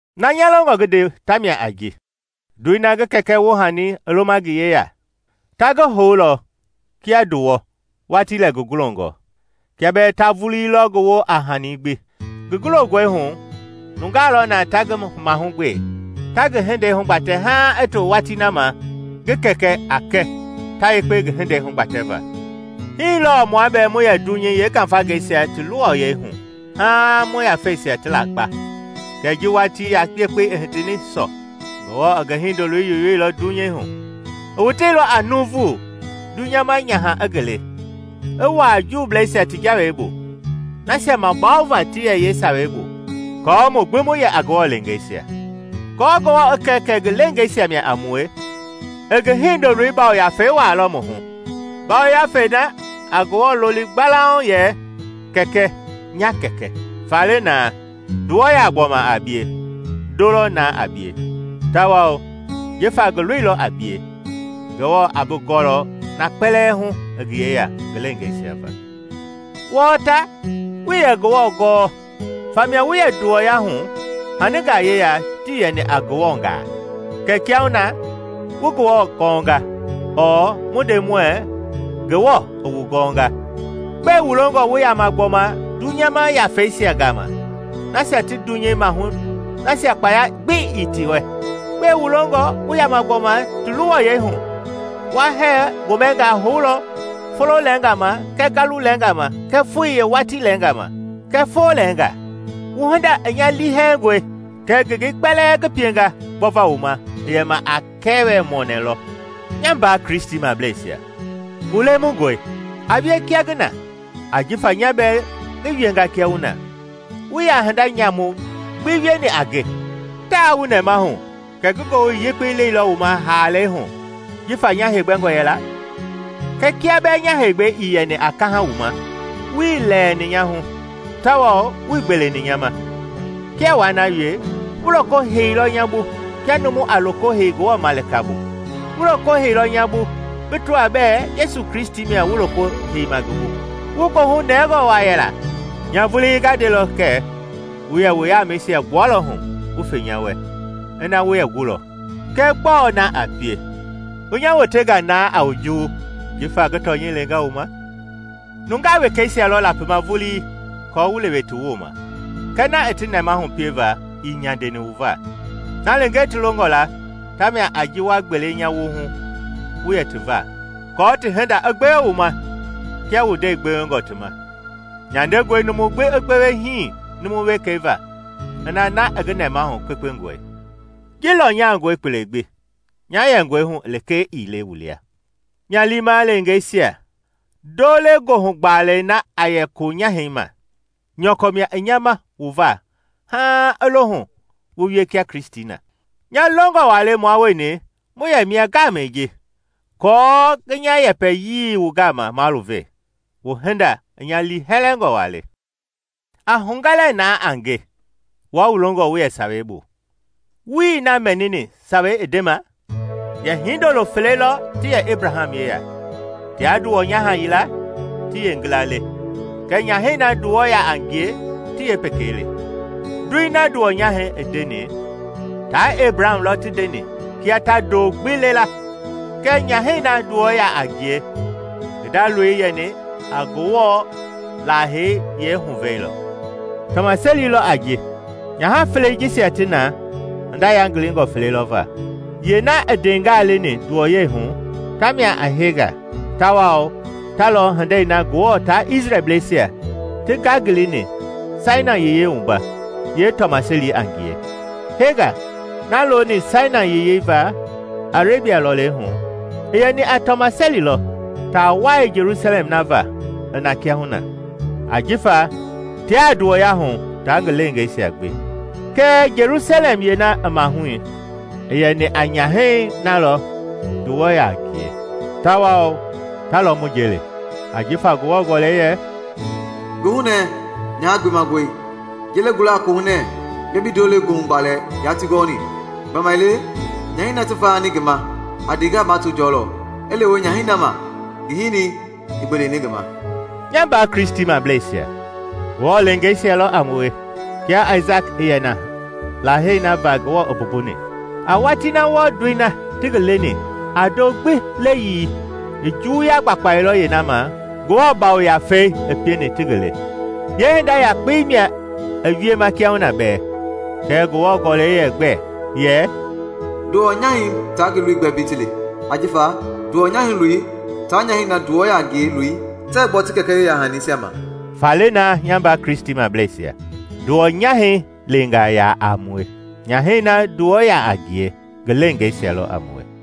Na nya longɔ ngi nde tamia a ji: ndoi na ngi kɛkɛ woohani i loma ngi yeya, ta ngi houlɔ kia nduwɔ watii lɛ ngi gulongɔ, kia bɛɛ ta vulii lɔ ngi woo a hanii gbi. Ngi gulongɔi hu, nungaa lɔ na ta ngi mahugbe, ta ngi hindei hugbatɛ haaŋ i to watii na ma ngi kɛkɛ a kɛ ta yekpe ngi hindei hugbatɛva. Hii lɔɔ mua bɛɛ mu yɛ dunyei yeengafangeisia ti luwɔyɛi hu haaŋ mu yafeisia ti lakpa. Kɛɛ ji watii yekpei i hitini sɔ, Ngewɔ i ngi Hindoloi yoyoilɔ dunyei hu. I woteilɔ a nuuvu, dunyama nyaha i ngi le, i wuaa Juublaa ti Jawei bu, nasia mabawova ti yɛ yee Sawei bu, aako mu gbi mu yɛ a Ngewɔ leengeisia. Kɔɔ Ngewɔ i kɛ kɛ ngi leengeisia mia a mue, i ngi Hindoloi Yafei wuaailɔ mu hu, Ngafei na a Ngewɔ loli gbalauŋ yɛ “Kɛkɛ, nya Kɛkɛ.” Faale na, ndɔwu yaa gbɔma a bie, ndo lɔ na a bie. Tawao jifa ngi lui lɔ a bie, Ngewɔ a bi gɔlɔ na kpɛlɛɛ hu i ngi yeya ngi leengeisia va. Wɔɔ ta, wuii yɛ Ngewɔ gɔɔ, famia wu yɛ nduwɔya hu haningaa yeya tii yɛni a Ngewɔngaa. Kɛɛ kiahuna na wu Ngewɔ gɔnga, ɔɔ, mu nde muɛɛ Ngewɔ i wu gɔnga. Gbɛe wu longɔ wu yama gbɔma dunyama yafeisia gama nasia ti dunyei mahu nasia kpaya gbi ii ti wɛ? Gbɛe wu longɔ wu yama gbɔma ti luwɔyɛi hu? Wa hɛɛ-gomɛngaa houlɔ folo lɛɛngaa ma kɛɛ ngalu lɛɛngaa kɛɛ foi yeewatii lɛɛnga kɛɛ foo lɛɛnga. Wu hinda i nya liihɛlɛngɔe! Kɛ ngengei kpɛlɛɛ ngi pienga gbɔva wu ma i yɛma a kɛɛwɛ-mɔɔnɛ lɔ? Nya mbaa Kristimableisia, wu lemungɔe, a wie kia ngi na, ajifa nya bɛɛ ngi wienga kia wu na. Wuii yaa hinda nyamu gbi wieni a nge. Taa wu nɛmahu kɛ ngi Ngowili Yekpei leilɔ wu ma haalei hu; jifa nya heegbɛngɔ yɛla. Kɛɛ kia bɛɛ nya heegbɛi i yɛni a kaha wu ma, wuii lɛɛni nya hu, tawao wuii gbeleni nya ma. Kia waa na wie, wu loko heiilɔ nya bu kia numu a loko hei Ngewɔ malika bu; wu loko heiilɔ nya bu bi tɔa bɛɛ Yesu Kristi mia wu loko heima ngi bu. Wu goohu nɛngɔ waa yɛla! Nya vuli nga ndelɔ kɛ wu yɛ wu yamɛisia gbualɔ hu wu fe nya wɛ, ina wu yɛ gulɔ. Kɛɛ gbɔɔ na wienga? Wu nya wotenga na a wu juwu jifa ngi tɔnyɛi lenga wu ma? Nungaa wekeisia lɔ lapima vulii aako wu lewe ti wooma, kɛɛ na i ti nɛmahu pieva ii nyandeni wu va. Na lekee ti longɔ la ta mia a ji wa gbele nya wohu wu yɛ ti va, aako ti hinda i gbewe wu ma kia wu ndɛi gbewengɔ ti ma. Nyandengɔe numu i gbewe hii numu wekei va ina na i ngi nɛmahu kpekpengɔe. Ji lɔnyangɔe kpele gbi, nya yɛngɔi hu lekee ii le wu lia. Nya liima leengeisia, ndo-le-goohu-gbalɛi na a yɛ koonyahɛi ma, nyɔkɔ mia i nya ma wu va haaŋ i lohu wu wie kia Kristi na. Nya longɔ waa le mua wueni mu yɛ mia ngaamɛi ji, aako ngi nya yɛpɛyii wu gama maluve. Wu hinda i nya liihɛlɛngɔ waa le. A hugɛ lɛɛ na a nge, wua wu longɔ wu yɛ Sawei bu, wuii na mɛnima Sawei i ndema? Yɛ hindolo fele lɔ ti yɛ Ebraham yeya, tia nduwɔ-nyaha yila ti yeengila le, kɛɛ nyahɛi na nduwɔ yaa ngie ti yeepekei le. Ndoi na nduwɔ-nyahɛi i ndeni taa Ebraham lɔ ti ndeni kia ta ndoo gbi le la, kɛɛ nyahɛi na nduwɔ yaa ngie ngi nda loi i yɛni a Ngewɔ Lahei yeehuvɛi lɔ. Tɔmaseli lɔ a ji. Nyaha felei jisia ti na hinda yangilingɔ fele lɔ va. Yeena i ndeengaa leni nduwɔyɛi hu tamia a Hega tawao ta lɔ hindei na Ngewɔ taa Isrɛlbleisia ti ngangilini Sainai Yiyei wumba, yeetɔmaseli a ngie. Hega, na looni Sainai Yiyei va Arebia lɔlei hu, i yɛni a tɔmaseli lɔ taa wai Jelusalɛm na va i na kiahuna, ajifa tiaa nduwɔya hu taa ngi leengeisia gbi. Kɛɛ Jelusalɛm yeena i mahui i yɛni a nyahɛi na lɔ nduwɔ yaa ngie, tawao ta lɔ mu nje le. Ajifa Ngewɔ Gɔlɛi yɛ, “Goohunɛɛ, nyaha gbemangɔi! Yelei gula a kohunɛ, bia bii ndoo-le-goohugbaalɛ yaati gɔɔni! Gbamaile nyahɛi na ti vayani ngi ma a ndeengaa mato jɔlɔ i lewe nyahɛi na ma ngi hinii ii gbeleni ngi ma.” Nya mbaa Kristimableisia, Ngewɔ leengeisia lɔ a wue kia Aisaki i yɛ na Lahei na va Ngewɔ i mbumbuni. A watii na wɔɔ ndoi na ti ngi leni a ndoo gbi leyii i juwuya gbakpailɔ yeena ma Ngewɔ Yafei i pieni ti ngi le. Yeehinda yakpei mia i wiema kiahuna bɛɛ. Kɛɛ Ngewɔ Gɔlɛi yɛ gbɛ? Yɛ, “Nduwɔ-nyahɛi taa ngi loi gbɛ mbei ti li; ajifa nduwɔ-nyahɛi loi taa nyahɛi na nduwɔ yaa ngie loi tɛɛ gbɔ ti kɛkɛ yeyahaniisia ma.” Faale na, nya mbaa Kristimableisia, nduwɔ-nyahɛi leengaa yaa a mue, nyahɛi na nduwɔ yaa ngie ngi leengeisia lɔ a mue.